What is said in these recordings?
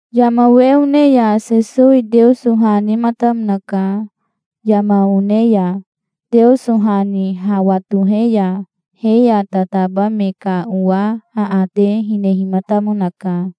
Yama we one ya Sesowi Teoso ha nematamonaka yama one ya. Teoso ha ni hawa tohe ya he ya tataba me ka owa aate hinehimatamonaka.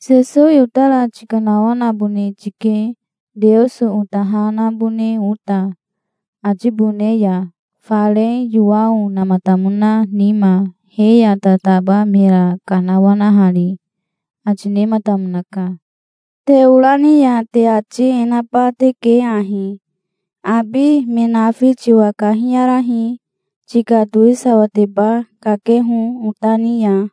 "Sesowi otara tikanawanabone tike Teoso ota ha nabone ota atibone ya, fare Yowao namatamona nima he ya tataba mera kanawanahari", ati nematamonaka. "Te ora ni ya te ati e naba teke ahi: 'Abi, me nafi tiwa kahiyarahi. Tika towisawateba kakeho ota ni ya.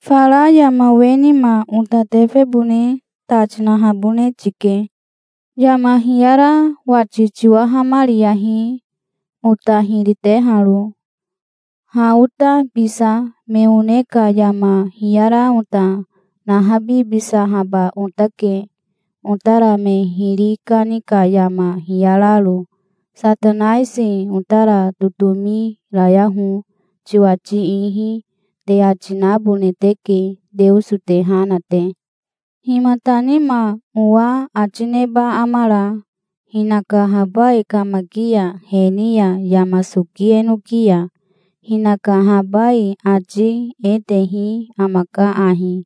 Fara yama we nima ota tefebone ta tinahabone tike. Yama hiyara wati tiwahamariyahi, ota hiri teharo. Ha ota bisa me one ka yama hiyara ota nahabibisahaba otake, otara me hiri kani ka yama hiyararo. Satanaisi otara totomi rayaho tiwati ihi', te ati nabone teke, Teoso te ha na te". "Himata nima owa ati neba amara, hinaka habai kamaki ya he ni ya yama soki enoki ya. Hinaka habai ati e tehi amaka ahi: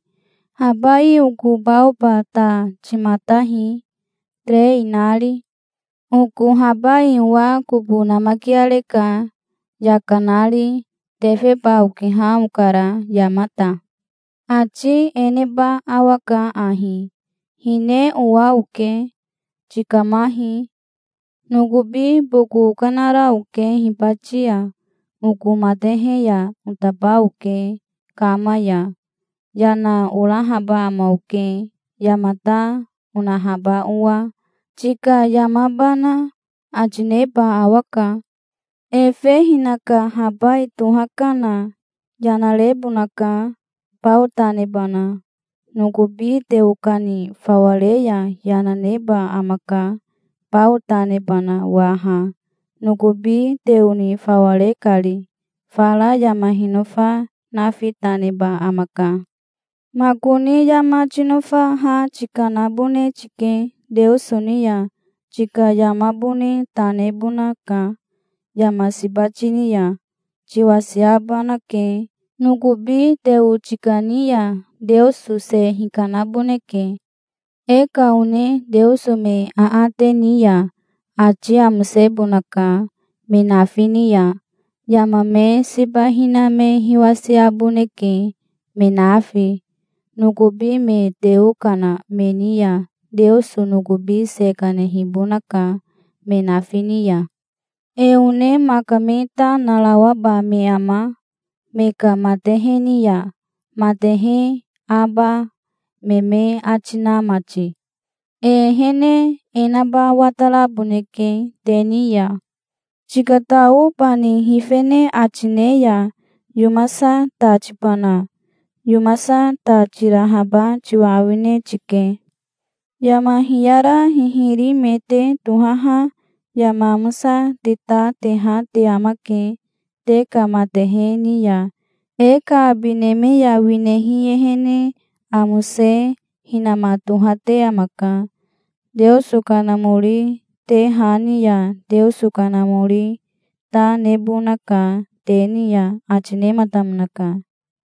'Habai oko baoba ta timatahi, terei nari. Oko habai owa kobo namakiareka, yaka nari. Tefeba okiha okara, yamata'. Ati e neba awaka ahi: 'Hine owa oke. Tikamahi. Nokobi boko okanara oke hibati ya. Oko matehe ya otaba oke kama ya. Yana orahaba ama oke, yama ta onahaba owa, tika yamabana', ati neba awaka. Efe hinaka habai toha kana yana rebonaka, bao ta nebana. Nokobi teo kani fawa re ya yana neba amaka, bao ta nebana waha, nokobi teo ni fawa re kari. Fara yama hinofa nafi ta neba amaka". "Makoni yama tinofa ha tikanabone tike Teoso ni ya. Tika yamabone ta nebonaka. Yama siba tini ya tiwasiabanake. Nokobi teo tikani ya Teoso se hikanaboneke. E ka one Teoso me aate ni ya ati amosebonaka me nafi ni ya. Yama me siba hina me hiwasiaboneke, me nafi. Nokobi me teo kana me ni ya Teoso nokobi se kanehibonaka, me nafi ni ya. E one maka me ta narawaba me ama, me ka matehe ni ya, matehe aba me me ati na mati? E ehene e naba wataraboneke te ni ya. Tikatao bani hifene ati ne ya yomasa ta tibana? Yomasa ta tirahaba tiwa awine tike. Yama hiyara hihiri me te tohaha yama amosa te ta teha te amake te ka matehe ni ya. E ka abi neme ya winehi ehene amose hinama tohate amaka. Teoso Kanamori te ha ni ya Teoso Kanamori ta nebonaka te ni ya", ati nematamonaka.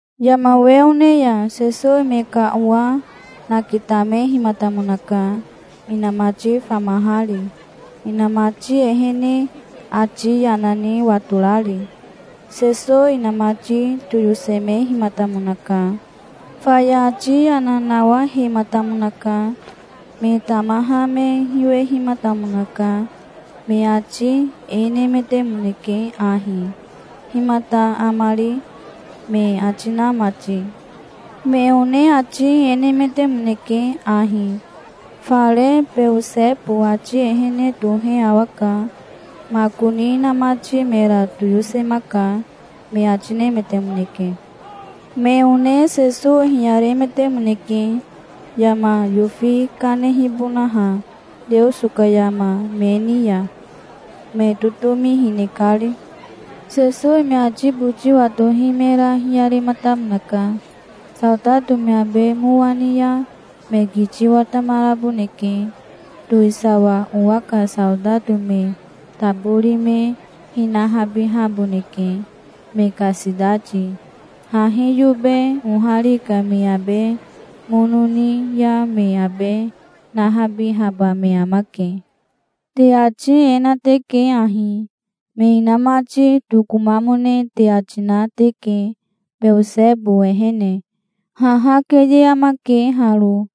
Yama we one ya Sesowi me ka owa nakitamehimatamonaka inamati famahari, inamati ehene ati yana ni watorari. Sesowi inamati toyosemehimatamonaka. Faya ati yana nawahematamonaka. Me tamaha me hiwehimatamonaka. Me ati e nemetemoneke ahi: "Himata amari?" me ati na mati. Me one ati e nemetemoneke ahi: "Fare Beosebo ati ehene tohe awaka. Makoni inamati mera toyosemaka", me ati nemetemoneke. Me one Sesowi hiyaremetemoneke yama yofi kanehibonaha Teoso ka yama me ni ya, me totomi hine kari. Sesowi me ati boti watohi mera hiyarematamonaka. "Saotato me abe mowa ni ya, me kiti watamaraboneke. Towisawa owa ka saotato me tabori me hinabihaboneke, me ka sitati. Hahi yobe ohari ka me abe mono ni ya me abe nahabihaba me amake. Te ati e na teke ahi: Me inamati tokomamone te ati na teke Beosebo ehene. Haha keye amake haro.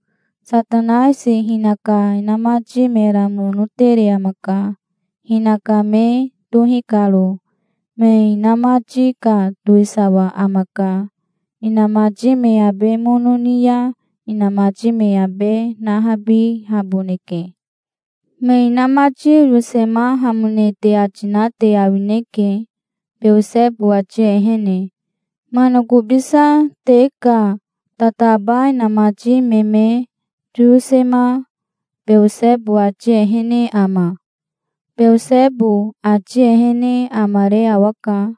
Satanaisi hinaka inamati mera mono tere amaka, hinaka me tohi karo. Me hinamati ka towisawa amaka. Inamati me abe mono ni ya inamati me abe nahabihaboneke. Me inamati oyosemahamone te ati na te awineke, Beosebo ati ehene. Manakobisa te ka tataba inamati me me toyosema Beosebo ati ehene ama? Beosebo ati ehene amare awaka.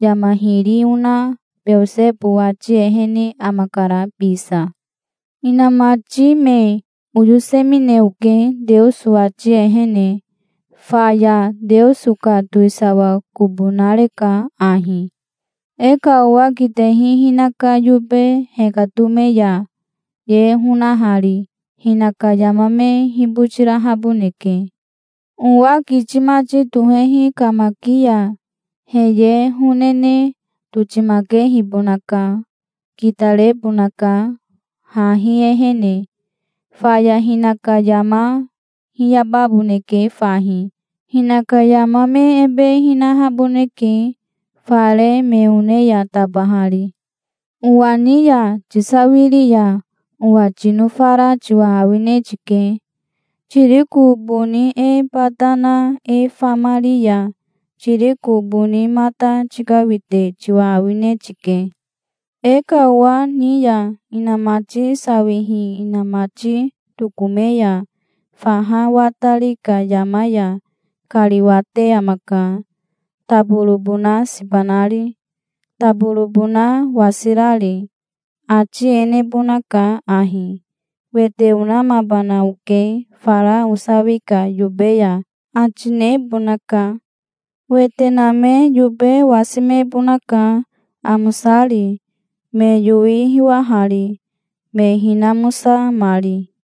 Yama hiri ona Beosebo ati ehene amakara bisa. Hinamati me oyosemine oke Teoso ati ehene. Faya Teoso ka towisawa kobo nareka ahi". "E ka owa kitehi hinaka yobe hekatome ya ye honahari hinaka yama me hibotirahaboneke. Owa kiti mati tohehi kamaki ya he ye honene totimakehibonaka. Kitarebonaka hahi ehene. Faya hinaka yama hiyababoneke fahi. Hinaka yama me ebe hinahaboneke fare me one ya tabahari. Owa ni ya tisawiri ya owa tinofara tiwa awine tike. Tiriko boni e bata na e famari ya tiriko boni mata tikawite tiwa awine tike". "E ka owa ni ya inamati sawihi inamati tokome ya faha watari ka yama ya kariwate amaka, taborobona siba nari, taborobona wasirari. Ati e nebonaka ahi: 'Wete onamabana oke fara osawi ka yobe ya', ati nebonaka. Wete name yobe wasimebonaka, amosari, me yowi hiwahari, me hinamosamari.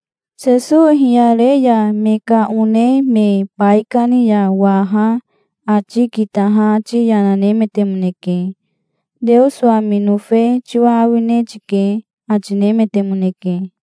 Sesowi hiyare ya me ka one me baikani ya waha ati kitaha ati yana nemetemoneke. "Teoso ami nofe tiwa awine tike", ati nemetemoneke.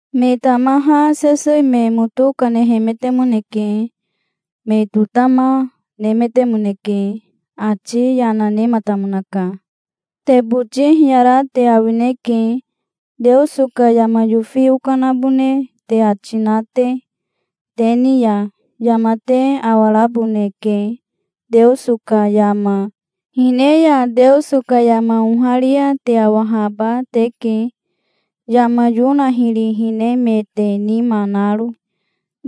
Me tamaha Sesowi me moto kanehemetemoneke. Me totama nemetemoneke. Ati yana nematamonaka. "Te boti hiyara te awineke, Teoso ka yama yofi okanabone te ati na te, te ni ya. Yama te awaraboneke Teoso ka yama. Hine ya Teoso ka yama oharia te awahaba teke, yama Yona hiri hinemete nima naro.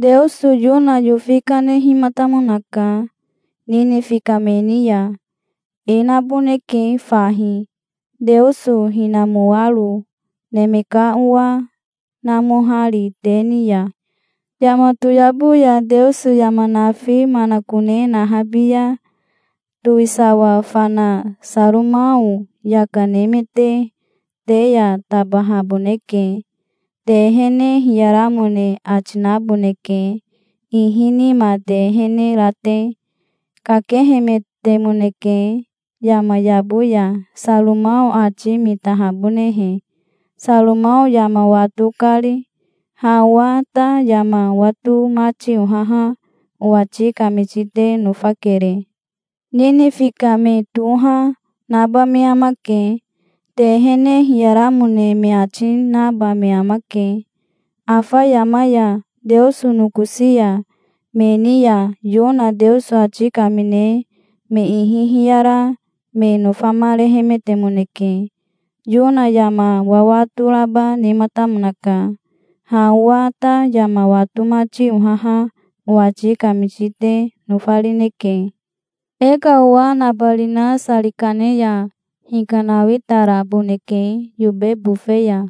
Teoso Yona yofi kanehimatamonaka Ninifi ka me ni ya. E naboneke fahi, Teoso hinamoaro Neme ka Owa namohari te ni ya. Yama toyabo ya Teoso yama nafi manakone nahabi ya towisawa fana Saromao yaka nemete te ya tabahaboneke. Te ehene hiyaramone ati naboneke, ihi nima te ehene ra te. Kakehemetemoneke yama yabo ya Saromao ati mitahabonehe Saromao yama wato kari. Ha owa ta yama wato mati ohaha owati kamiti te nofakere. Ninifi ka me toha, naba me amake. Te ehene hiyaramone me ati, naba me amake afa yama ya, Teoso nokosi ya. Me ni ya Yona Teoso ati kamine me ihi hiyara me nofamarehemetemoneke. Yona yama wawato raba nematamonaka. Ha owa ta yama wato mati ohaha owati kamiti te nofarineke". "E ka owa nabarina sari kane ya hikanawitaraboneke yobe bofe ya.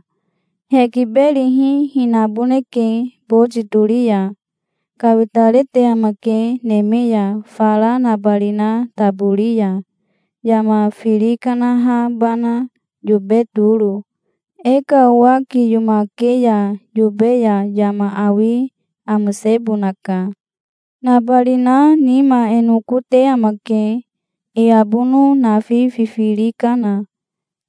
Hekiberihi hinaboneke boti tori ya. Kawitarete amake neme ya fara nabarina tabori ya yama firi kanahabana yobe toro. E ka owa kiyomake ya yobe ya yama awi amosebonaka. Nabarina nima e noko te amake, e abono nafi fifiri kana.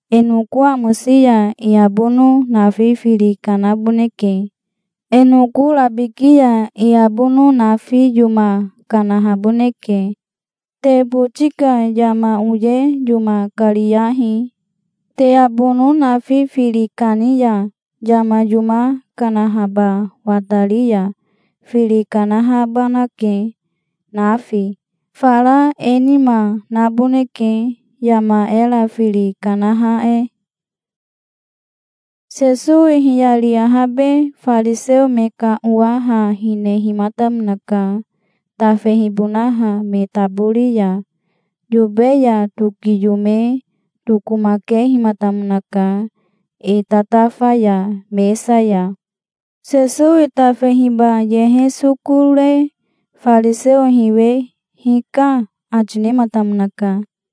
E noko amosi ya e abono nafi firi kanaboneke. E noko rabiki ya e abono nafi yoma kanahaboneke. Te boti ka yama oye yoma kariyahi. Te abono nafi firi kani ya, yama yoma kanahaba watari ya, firi kanahabanake, nafi. Fara e nima naboneke, yama era firi kanaha e". Sesowi hiyari ahabe fariseo me ka owa ha hinehimatamonaka tafehibonaha me tabori ya. Yobe ya tokiyome tokomakehimatamonaka e tatafa ya mesa ya. Sesowi tafehiba yehe soko re fariseo hiwe "Hika", ati nematamonaka.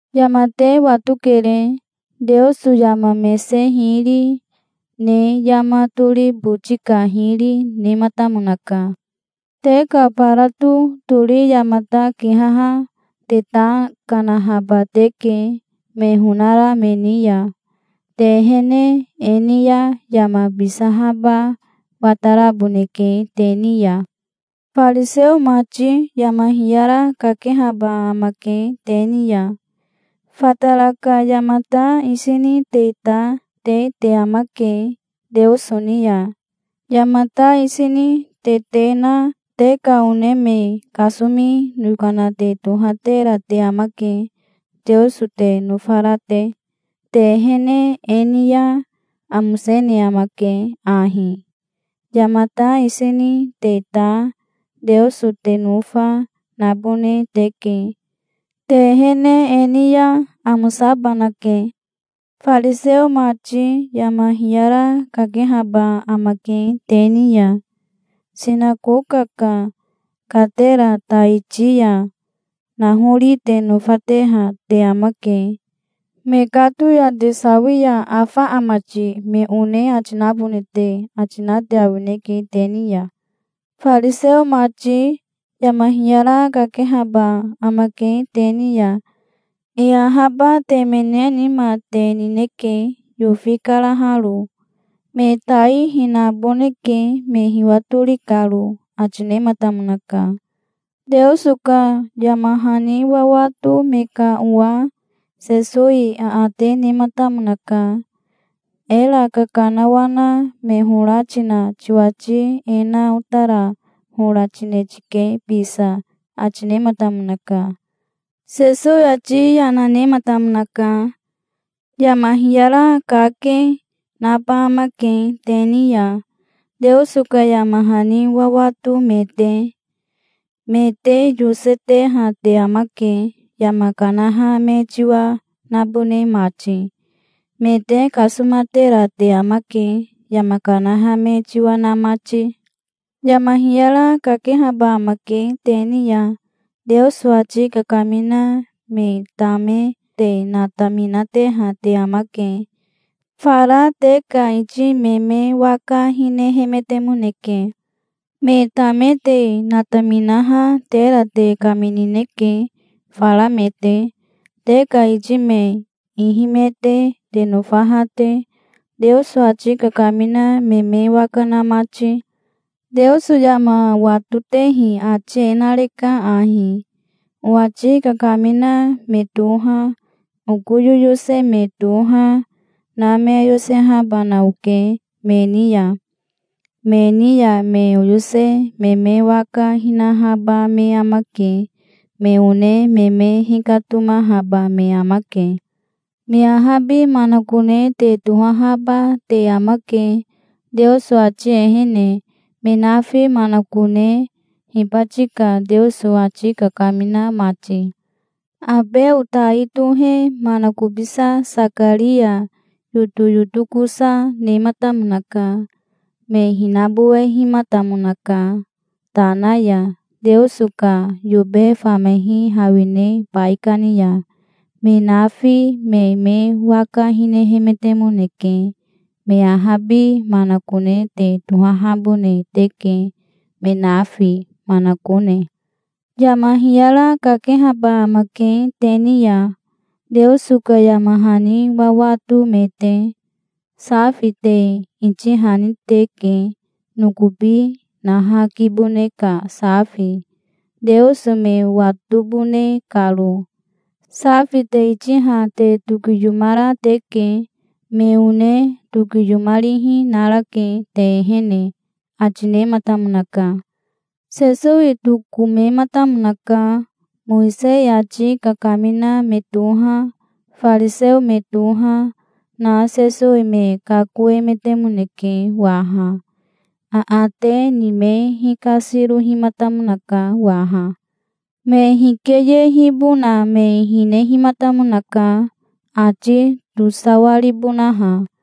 Yama te watokere. Teoso yama mese hiri ne yama tori boti ka hiri nematamonaka. Te ka barato tori yamata kihaha te ta kanahaba teke me honara me ni ya. Te ehene e ni ya yama bisahaba wataraboneke te ni ya". "Fariseo mati yama hiyara kakehaba amake te ni ya. Fatara ka yamata isi ni te ta te te amake Teoso ni ya. Yamata isi ni te te na te ka one me kasomi yokana te tohatera te amake, Teoso te nofara te. Te ehene e ni ya amosene amake ahi. Yamata isi ni te ta, Teoso te nofa, nabone teke. Te ehene e ni ya amosabanake". "Fariseo mati yama hiyara kakehaba amake te ni ya. Sinakoka ka katera taiti ya nahori te nofateha te amake. Mekato ya te sawi ya 'Afa ama ti,' me one ati nabone te ati na te awineke te ni ya". "Fariseo mati, yama hiyara kakehaba amake te ni ya. E ahaba temene nima te nineke yofi karaharo. Me tai hinaboneke, me hiwatori karo", ati nematamonaka. Teoso ka yama hani wawato me ka owa Sesowi aate nematamonaka. "Era kakanawana me hora tina tiwati e na otara hora tine tike bisa", ati nematamonaka. Sesowi ati yana nematamonaka. "Yama hiyara kake, naba amake te ni ya, Teoso ka yama hani wawato me te. Me te yoseteha te amake, yama kanaha me tiwa nabone mati. Me te kasomatera te amake, yama kanaha me tiwa na mati. Yama hiyara kakehaba amake te ni ya. Teoso ati kakamina me tame te nataminateha te amake. Fara te ka iti me me waka hinehemetemoneke. Me tame te nataminaha tera te kaminineke fara me te, te ka iti me ihimete te nofaha te, Teoso ati kakamina me me waka na mati. Teoso yama watotehi ati e nareka ahi: 'Owati kakamina me toha, oko yoyose me toha, na me oyosehabana oke me ni ya. Me ni ya me oyose me me waka hinahaba me amake. Me one me me hikatomahaba me amake'. Me ahabi manakone te tohahaba te amake, Teoso ati ehene, me nafi manakone, hibati ka Teoso ati kakamina mati. Abeo tai tohe manakobisa Sakaria yotoyotokosa nematamonaka. Me hinabowehimatamonaka tana ya Teoso ka yobe famehi hawine baikani ya. Me nafi me me waka hinehemetemoneke. Me ahabi manakone te tohahabone teke, me nafi manakone. Yama hiyara kakehaba amake te ni ya, Teoso ka yama hani wawato me te. Safi te itihani teke, nokobi naha kibone ka safi, Teoso me watobone karo. Safi te itiha te tokiyomara teke. Me one tokiyomarihi narake te ehene", ati nematamonaka. Sesowi tokomematamonaka. Mowisei ati kakamina me toha, fariseo me toha, na Sesowi me kakoemetemoneke waha. Aate ni me hikasirohimatamonaka waha. Me hikeyehibona me hinehimatamonaka, ati tosawaribonaha.